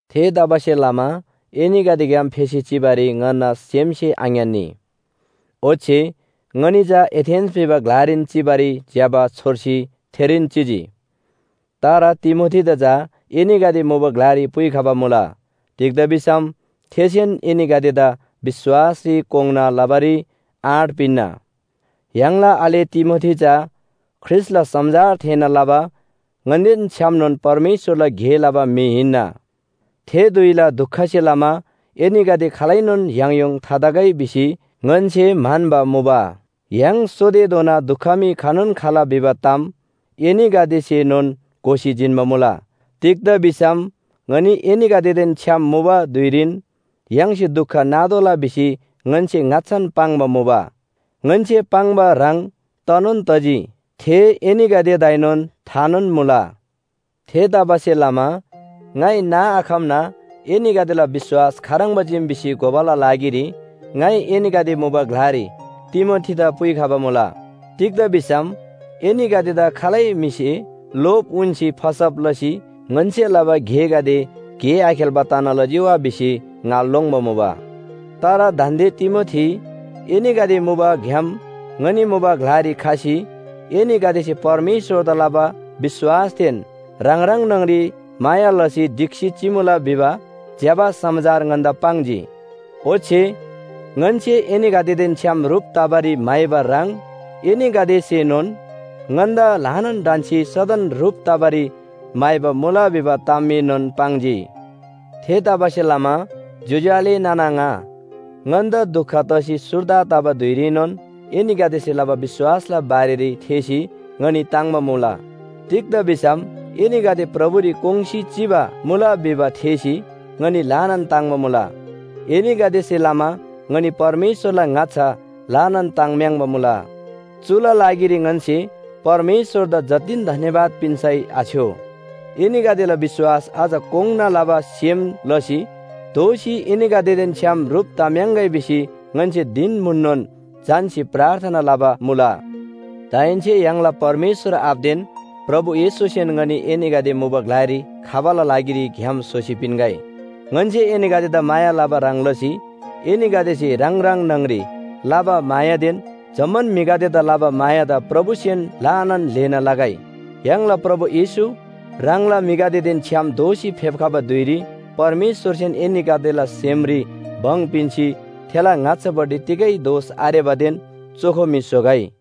थेतबासेलमा एनीगदेग्‍याम फेसी चिबारी ङन्‍ना सेमसे आङ्‌यान्‍नी। ओच्‍छे ङनी चा एथेन्‍स भिबा ग्‍लारीन चिबारी ज्‍यबा छोर्सी थेरीन चिजी। तर तिमोथीदा चा एनीगदे मुबा ग्‍लारी पुइखबा मुला। तिग्‍दा भिसम थेसेन एनीगदेदा विश्‍वासरी कोङ्‌ना लबारी आँट पिन्‍ना। य्‍हाङला आले तिमोथी चा ख्रीष्‍टला समाचार थेःना लबा ङन्‍देन छ्‌यामनोन परमेश्‍वरला गे लबा म्‍हि हिन्‍ना। थे धुइला दुखसे लमा एनीगदे खालैनोन याङयोङ थातगै भिसी ङन्‍से म्‍हन्‍बा मुबा। य्‍हाङ सोतेधोना दुख मी खनोन खला भिबा ताम एनीगदेसेनोन घोसी जिन्‍बा मुला। तिग्‍दा भिसम ङनी एनीगदेदेन छ्‌याम मुबा धुइरीन य्‍हाङसे दुख नातोःला भिसी ङन्‍से ङाच्‍छान पाङ्बा मुबा। ङन्‍से पाङ्बा ह्रङ् तनोन तजी, थे एनीगदेदाएनोन थानोन मुला। थेतबासेलमा ङाइ नाआखम्‍ना एनीगदेला विश्‍वास खाह्रङ्बा चीम भिसी घोबाला लागिरी ङाइ एनीगदे मुबा ग्‍लारी तिमोथीदा पुइखबा मुला। तिग्‍दा भिसम एनीगदेदा खालै म्‍हिसे लोभ उन्‍सी फसब लसी ङन्‍से लबा गेगदे गे आखेल्‍बा तना लजी वा भिसी ङा लोङ्‌बा मुबा। तर दान्‍दे तिमोथी एनीगदे मुबाग्‍याम ङनी मुबा ग्‍लारी खसी एनीगदेसे परमेश्‍वरदा लबा विश्‍वासदेन ह्राङ ह्राङ न्‍हङरी माया लसी ढिक्‍सी चिमुला भिबा ज्‍यबा समाचार ङन्‍दा पाङ्जी। ओच्‍छे ङन्‍से एनीगदेदेन छ्‌याम ह्रुप तबारी म्‍हाइबा ह्रङ् एनीगदेसेएनोन ङन्‍दा ल्‍हानान ढन्‍सी सदन ह्रुप तबारी म्‍हाइबा मुला भिबा तामएनोन पाङ्जी। थेतबासेलमा ज्‍योज्‍यो आले नाना आङा, ङन्‍दा दुख तसी सुर्दा तबा धुइरीनोन एनीगदेसे लबा विश्‍वासला बारेरी थेःसी ङनी ताङ्‍बा मुला। तिग्‍दा भिसम एनीगदे प्रभुरी कोङ्‌सी चिबा मुला भिबा थेःसी ङनी ल्‍हानान ताङ्‍बा मुला एनीगदेसे लमा ङनी परमेश्‍वरला ङाच्‍छा ल्‍हानान ताङ्म्‍याङ्बा मुला। चुला लागिरी ङन्‍से परमेश्‍वरदा जतिन धन्‍यवाद पिन्‍सै आछ्‌यो। एनीगदेला विश्‍वास अझ कोङ्‌ना लबा सेम लसी दोःसी एनीगदेदेन छ्‍याम ह्रुप तम्‍याङ्‌गै भिसी ङन्‍से धिन म्‍हुननोन झन्‍सी प्रार्थना लबा मुला। दाहेन्‍से य्‍हाङला परमेश्‍वर आबादेन प्रभु येशूसेन ङनी एनीगदे मुबा ग्‍लारी खबाला लागिरी ग्‍याम स्‍होसी पिन्‍गै। ङन्‍से एनीगदेदा माया लबा ह्रङ् लसी एनीगदेसे ह्राङ ह्राङ न्‍हङरी लबा मायादेन जम्‍मान म्‍हिगदेदा लबा मायादा प्रभुसेन ल्‍हानान ल्‍हेना लगै। य्‍हाङला प्रभु येशू ह्राङला म्‍हिगदेदेन छ्‌याम दोःसी फेप्‍खबा धुइरी परमेश्‍वरसेन एनीगदेला सेमरी भङ पिन्‍सी थेला ङाच्‍छापट्टि तिगै दोष आरेबादेन चोखो म्‍हि स्‍होगै।